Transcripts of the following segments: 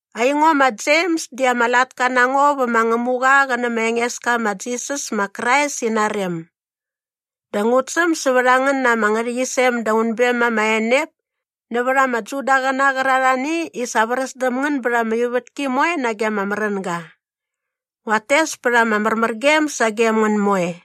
Aingo ma Jems di ama latka na ngo vä ma Ngämuqa qä nä ma Engeska ma Jisas ma Krais ina rem. Dä ngut säm sävät a ngän ama ngärhäqyisem da unbem ama enep nävät ama Judaqäna qärarhani i sa vräs däm ngän bät ama ivätki moe nage ama märänga. Nguat tes pät ama märmärgem sagem ngän moe.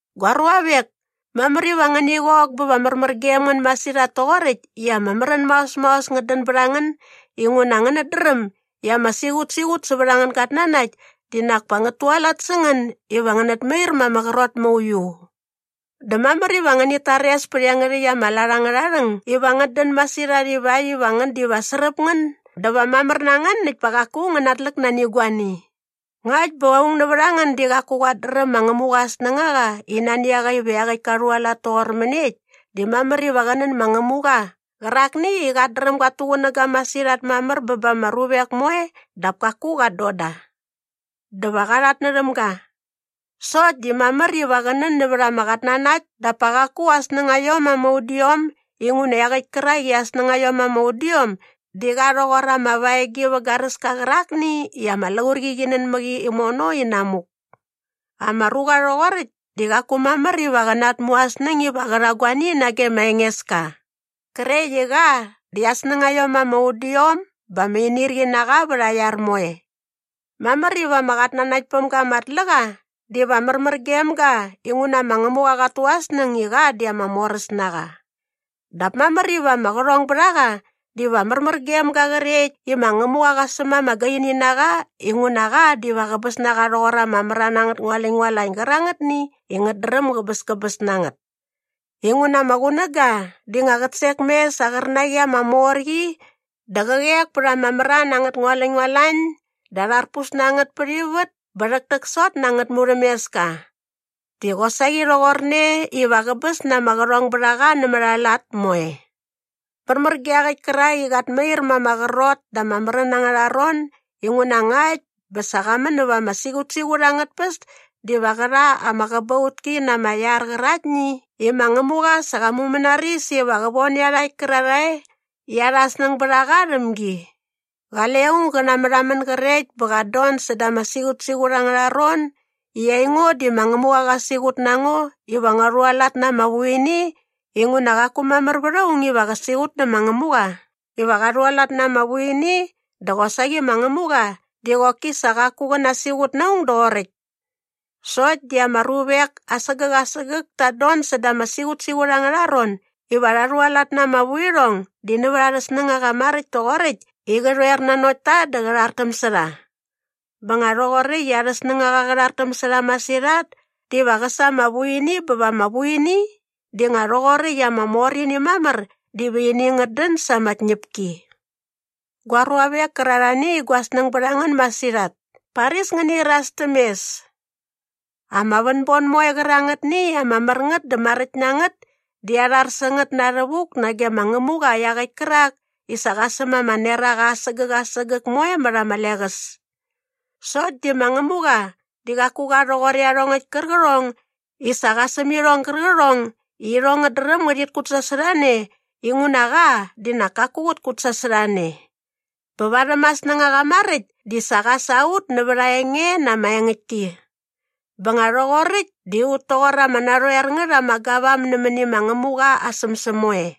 Gua ruavek, mamär iva ngäni qok bä va märmär gem ngän masirhat toqoräkt i ama märän maos maos ngät dän bät a ngän inguna ngänät dräm i ama siqutsiqut sävät angän gatnanakt di nak pa ngät tualat sä ngän iva ngänät mair ma ama qrot mauiu. Dä mamär iva ngänit tares pät iangärhäkt ama lat angärha rhäng iva ngät dän masirhat ivakt iva ngän diva sräp ngän dä va mamär na ngän näkt pa qaku ngän natläk nani guani. Ngakt bä aung nävät a ngän di qaku qat dräm ma Ngämuqa aa snängaqa i nani a qa iva iaqäkt ka rhualat toqor mäniekt di mamär iva qä nän ma Ngämuqa qärakni i qat dräm gat tuqunäga masirhat mamär bä ba ama ruvek moe dap kaku qat don da. Dä va qa rhatnärhäm ga. Sokt di mamär iva qä nän nävät ama qatnanakt dap pa qaku aa snängaiom ama udiom inguna iaqäkt kärak i aa snängaiom ama udiom di qa rhoqor ama vaegi vä garäska qärakni i ama laurqi qi nän mä qi imono inamuk. Ama ruqa rhoqoräkt di qaku mamär iva qä natmu aa snäng iva qä rha guani nage ma Engeska qrekt i qa di aa snängaiom ama udiom bä ama inirqi na qa vät aa iar moe. Mamär iva ama qatnanaktpämga ama tlä qa diva märmär gem ga inguna ma Ngämuqa qat tu aa snäng i qa di ama moräs na qa. Dap mamär iva ama qärhongbärhaqa diva märmär gem ga qrekt i ma Ngämuqa qä säm ama gaini na qa inguna qa diva qäbäs na qa rhoqor ama mran angät ngualäñngualañ gärangätni i ngät dräm gäbäskäbäs na ngät. Inguna ama qunäga di nga qät sek mes sa aa qärnaqi ama mor qi dä qä qek pät ama mran angät ngualäñngualañ dä arharpus na ngät pät ivät bä rhäktäksot na angät murhämeska. Di qosaqi rhoqorne iva qäbäs na ama qärhongbärhaqa nämät aa lat moe. Märmär ge iaqäkt kärak i qat mair ma ama qrot da ama märän angärha ron inguna ngakt bä sa qa män näva ama siqutsiqut angät tpäs diva qä rha ama qäbautki na ama iar qäraktni i ma Ngämuqa sa qa mumänaris iva qä von iarhakt kärarhae i arha snäng bät a qa rhäm gi. Qale aung gä namärhamän grekt bä qat don säda ama siqutsiqut angärha ron i aingo di ma Ngämuqa qä siqut na ngo iva ngua rhualat na ama vuini inguna qaku mamär vät aung iva qä siqut nä ma Ngämuqa iva qa rhualat na ama vuini dä qosaqi ma Ngämuqa di qoki sa qaku qä nasiqut na aung doqoräkt. Sokt di ama ruvek asägäk asägäk tat don säda ama siqutsiqut angärha ron iva rha rhualat na ama vuirhong di nävät arhä snängaqa maräkt toqoräkt i qä rhoer nanokt ta dä qä rhartäm sä rha. Bä nga rhoqoräkt i arhä snängaqa qä rhartäm sä rha masirhat diva qä sa ama vuini bä va ama vuini di nga rhoqoräkt i ama mor ini mamär diva ini ngät dän sa ama tñäpki. Gua ruavek kärarhani i gua snäng bät a ngän masirhat, paris ngäni iras täm mes. Ama vänbon moe qärangätni i ama mär ngät dä maräkt na ngät di arhar sä ngät na rhävuk nage ma Ngämuqa iaqäkt kärak i sa qa säm ama neraqa asägäk asägäk moe mät ama leqäs. Sokt di ma Ngämuqa di qaku qa rhoqor iarhongäkt kärqärhong i sa qa säm irhong gärqärhong i irhong ngät dräm ngärhit kutsasorhane inguna qa di nak kaku qät kutsasorhane. Bä varhäm aa snängaqa maräkt di qa sa ut nävät aa enge na ama engäktki. Bä nga rhoqoräkt di ut toqor ama narhoer ngät ama gavam nämäni ama ma Ngämuqa aa sämsäm moe.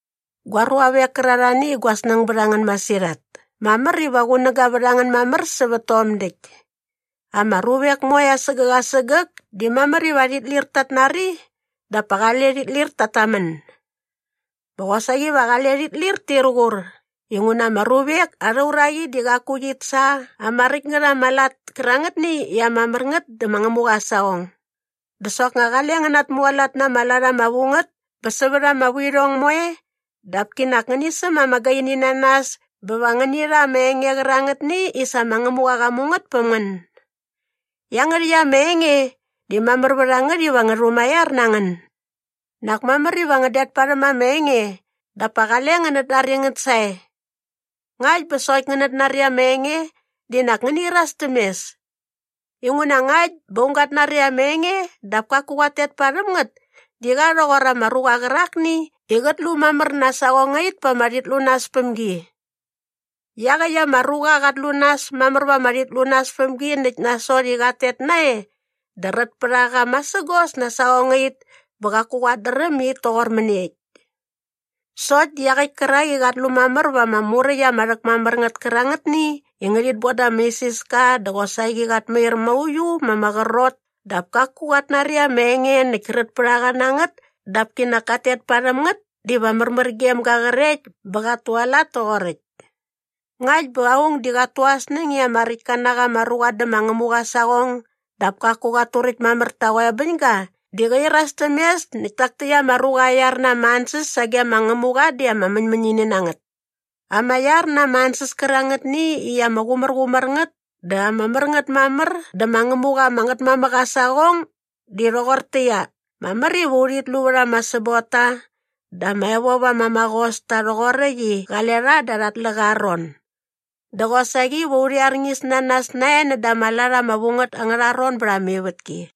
Gua ruavek kärarhani i gua snäng bät a ngän masirhat, mamär iva qunäga vät a ngän mamär sävät tom däkt. Ama ruvek moe asägäk asägäk di mamär iva rhit lir tat nari dap pa qale rhit lir tat tamän. Bä qosaqi va qale rhit lir tir qur inguna ama ruvek arha uraqi di qaku qit sa ama räkt ngät ama lat kärangätni i ama mär ngät dä ma Ngämuqa aa saqong. Dä soknga qale ngän natmualat na ama lat ama vu ngät bä sävät ama vuirhong moe dap kinak ngäni säm ama gaini na nas bä va ngäni rha ama enge qärangätni i sa ma Ngämuqa qa mu ngät päm ngän. Iangärhäkt ama enge di mamär vät a ngät iva ngä rhumaiar na ngän. Nak mamär iva ngän det parhäm ama enge dap pa qale ngänät nari ngät sae. Ngakt bä sokt ngänät nari ama enge di nak ngäni iras täm mes. Inguna ngakt bä aung gat nari ama enge dap kaku qat tet parhäm ngät di qa rhoqor ama ruqa qärakni i qät lu mamär na aa saqongait pa ama rhitlunaspämgi. Iaqäkt ama ruqa qat lu nas mamär va ama rhitlunaspämgi näkt nasot i qat tet nae dä rät pät a qa masägos na aa saqongait bä qaku qat dräm i it toqor mäniekt. Sokt di iaqäkt kärak i qat lu mamär va ama muräkt ama rhäkmamär ngät kärangätni i ngärhit bon da ama isiska dä qosaqi qat mair mauiu ma ama qrot dap kaku qat nari ama enge näkt rät pät a qa na ngät dap kinak kat tet parhäm ngät diva märmär gem ga qrekt bä qat tualat toqoräkt. Ngakt bä aung di qat tu aa snäng i ama räktka na qa ama ruqa dä ma Ngämuqa aa saqong dap kaku qat turäkt mamär ta aa qoebäñga di qä iras täm mes näkt tak täkt ama ruqa aa iar na ama ansäs sage ma Ngämuqa di ama mäñmäñini na ngät. Ama iar na ama ansäs kärangätni i ama qumärqumär ngät dä ama mär ngät mamär dä ma Ngämuqa ama Ngätmamäk aa saqong di rhoqortäqyia, mamär iva urhit lu vät ama säbotta dä ama evop ama maqos ta rhoqoräkt i qale rha da arha tläqa aa ron. Dä qosaqi va urhi arñis na nas nae näda ama lat ama vu ngät angärha ron bät ama ivätki.